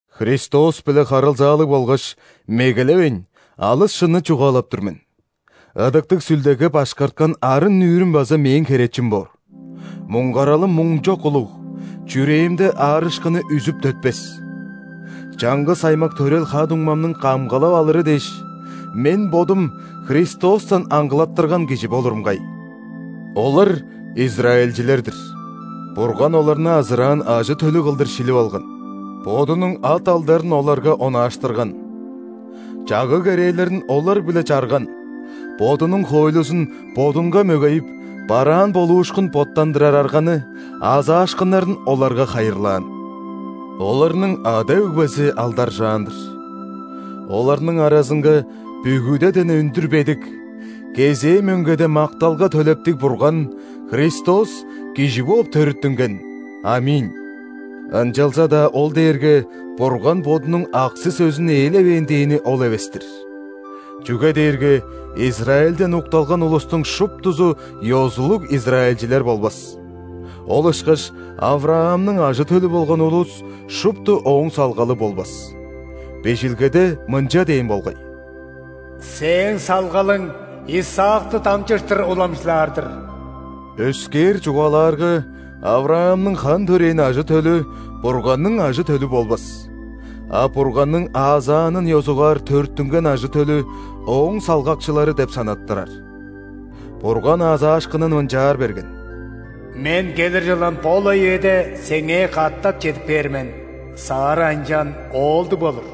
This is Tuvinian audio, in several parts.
Христос-биле харылзаалыг болгаш, мегелевейн, алыс шынны чугаалап тур мен, Ыдыктыг Сүлдеге башкарткан арын-нүүрүм база мээң херечим боор: муңгаралым муңчок улуг, чүрээмде аарышкыны үзүп төтпес! Чаңгыс аймак төрел ха-дуңмамның камгалал алыры дээш, мен бодум Христостан аңгылаттырган кижи болурум кай. Олар – израильчилер-дир: Бурган оларны азыраан ажы-төлү кылдыр шилип алган; Бодунуң ат-алдарын оларга онааштырган; чагыг-керээлерин олар-биле чарган; Бодунуң хоойлузун, Бодунга мөгейип, бараан болуушкун боттандырар арганы, аазаашкыннарын оларга хайырлаан. Оларның ада-өгбези алдаржаан-дыр. Оларның аразынга бүгүдеден өндүр бедик, кезээ мөңгеде макталга төлептиг Бурган – Христос кижи бооп төрүттүнген. ·Аминь! Ынчалза-даа ол дээрге Бурган Бодунуң аксы-сөзүн ээлевээн дээни ол эвес-тир. Чүге дээрге Израильден укталган улустуң шуптузу ёзулуг израильчилер болбас. Ол ышкаш ·Авраамның ажы-төлү болган улус шупту ооң салгалы болбас. Бижилгеде мынча дээн болгай: «Сээң салгалың Исаакты дамчыштыр уламчылаар-дыр». Өскээр чугаалаарга, Авраамның хан төрээн ажы-төлү Бурганның ажы-төлү болбас, а Бурганның аазаанын ёзугаар төрүттүнген ажы-төлү ооң салгакчылары деп санаттырар. Бурган аазаашкынын мынчаар берген: «Мен келир чылын бо-ла үеде сеңээ катап чедип кээр мен, Сарра ынчан оолдуг болур».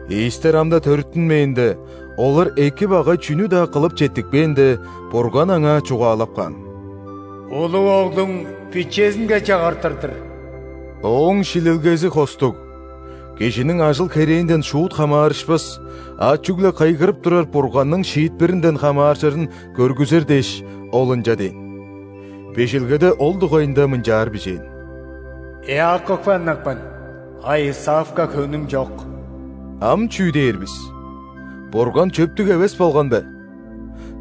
Ийистер ам-даа төрүттүнмээнде, олар эки, багай чүнү-даа кылып четтикпээнде, Бурган аңаа чугаалап каан: «Улуг оглуң бичезинге чагыртыр-дыр». Ооң шилилгези хостуг, кижиниң ажыл-херээнден шуут хамаарышпас, а чүгле кыйгырып турар Бурганның шиитпиринден хамааржырын көргүзер дээш, Ол ынча дээн. Бижилгеде ол дугайында мынчаар бижээн: «Иаковка ынак мен, а Исавка хөңнүм чок». Ам чүү дээр бис? Бурган чөптүг эвес болган бе?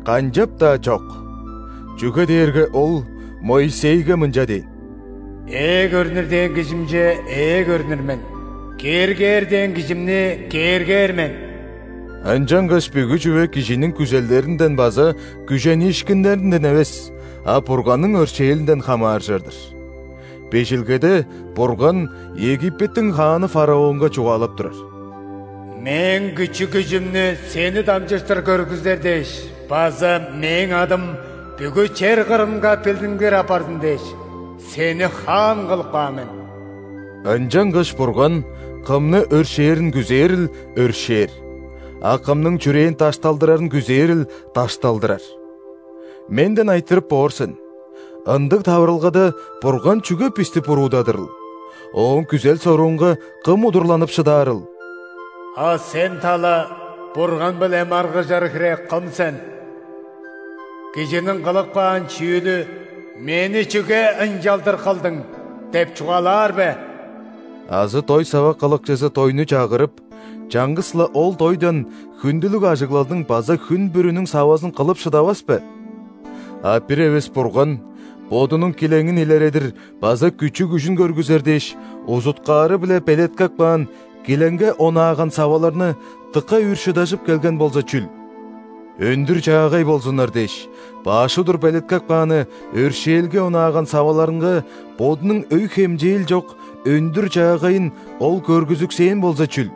Канчап-даа чок! Чүге дээрге Ол Моисейге мынча дээн:«Ээ көрнүр дээн кижимче ээ көрнүр мен.Кээргээр дээн кижимни кээргээр мен». Ынчангаш бүгү чүве кижиниң күзелдеринден база күжениишкиннеринден эвес, а Бурганның өршээлинден хамааржыр-дыр. Бижилгеде Бурган Египеттиң хааны фараонга чугаалап турар: «Мээң күчү-күжүмнү сени дамчыштыр көргүзер дээш база Мээң адым бүгү чер кырынга билдингир апарзын дээш, сени хаан кылып каан мен». Ынчангаш Бурган кымны өршээрин күзээрил – өршээр, а кымның чүрээн дашталдырарын күзээрил – дашталдырар. Менден айтырып боор сен: «Ындыг таварылгада Бурган чүге бисти буруудадырыл? Ооң күзел-соруунга кым удурланып шыдаарыл?» А сен, тала, Бурган-биле маргыжар хире кым сен? Кижиниң кылып каан чүүлү: «Мени чүге ынчалдыр кылдың?» – деп чугаалаар бе? Азы дой сава кылыкчызы дойну чагырып, чаңгыс-ла ол дойдан хүндүлүг ажыглалдың база хүн бүрүнүң савазын кылып шыдавас бе? А бир эвес Бурган, Бодунуң килеңин илередир база күчү-күжүн көргүзер дээш, узуткаары-биле белеткеп каан, «Килеңге онааган саваларны» дыка үр шыдажып келген болза чүл? Өндүр-чаагай болзуннар дээш баш удур белеткеп кааны, «Өршээлге онааган саваларынга» Бодунуң өй-хемчээл чок өндүр-чаагайын Ол көргүзүксээн болза чүл?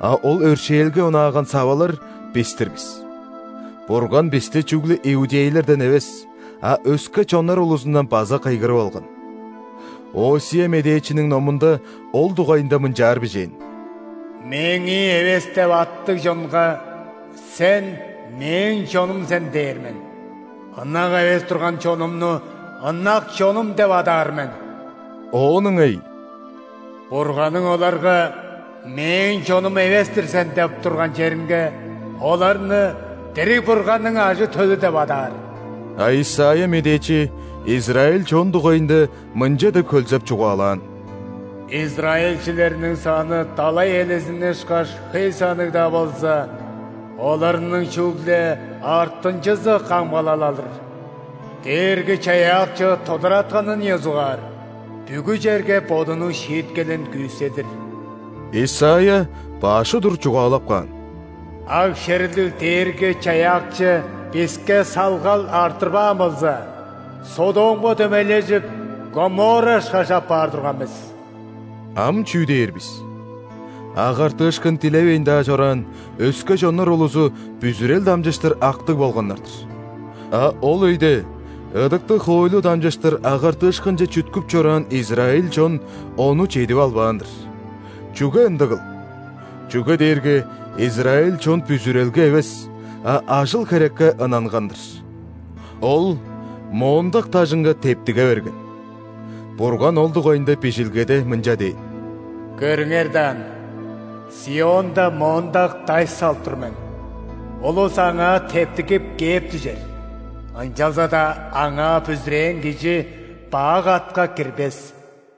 А ол «Өршээлге онааган савалар» – бис-тир бис. Бурган бисти чүгле иудейлерден эвес, а өске чоннар улузундан база кыйгырып алган. Осия медээчиниң номунда ол дугайында мынчаар бижээн:«„Мээңии эвес“ деп аттыг чонга: „Сен – Мээң чонум сен“ – дээр мен;ынак эвес турган чонумну ынак чонум деп адаар мен». Оон ыңай:«Бурганның оларга: „Мээң чонум эвес-тир сен“ – деп турган черингеоларны дириг Бурганның ажы-төлү деп адаар». А Исайя медээчи израиль чон дугайында мынча деп хөлзеп чугаалаан:«Израильчилерниң саны далай элезини ышкаш хөй санныг-даа болза,оларның чүгле артынчызы камгалал алыр. Дээрги-Чаяакчы тодаратканын ёзугаар бүгү черге Бодунуң шииткелин күүседир». Исайя баш удур чугаалап каан:«Аг-шериглиг Дээрги-Чаяакчы биске салгал арттырбаан болза,Содомга дөмейлежип, Гоморра ышкаш апаар турган бис». Ам чүү дээр бис? Агартыышкын дилевейн-даа чораан өске чоннар улузу бүзүрел дамчыштыр актыг болганнар-дыр. А ол өйде ыдыктыг хоойлу дамчыштыр агартыышкынче чүткүп чораан израиль чон ону чедип албаан-дыр. Чүге ындыгыл? Чүге дээрге израиль чон бүзүрелге эвес, а ажыл-херекке ынанган-дыр. Ол моондак дажынга тептиге берген. Бурган ол дугайында Бижилгеде мынча дээн:«Көрүңер даан, ·Сионда моондак даш салып тур мен –улус аңаа тептигип кээп дүжер.Ынчалза-даа Аңаа бүзүрээн кижи бак атка кирбес».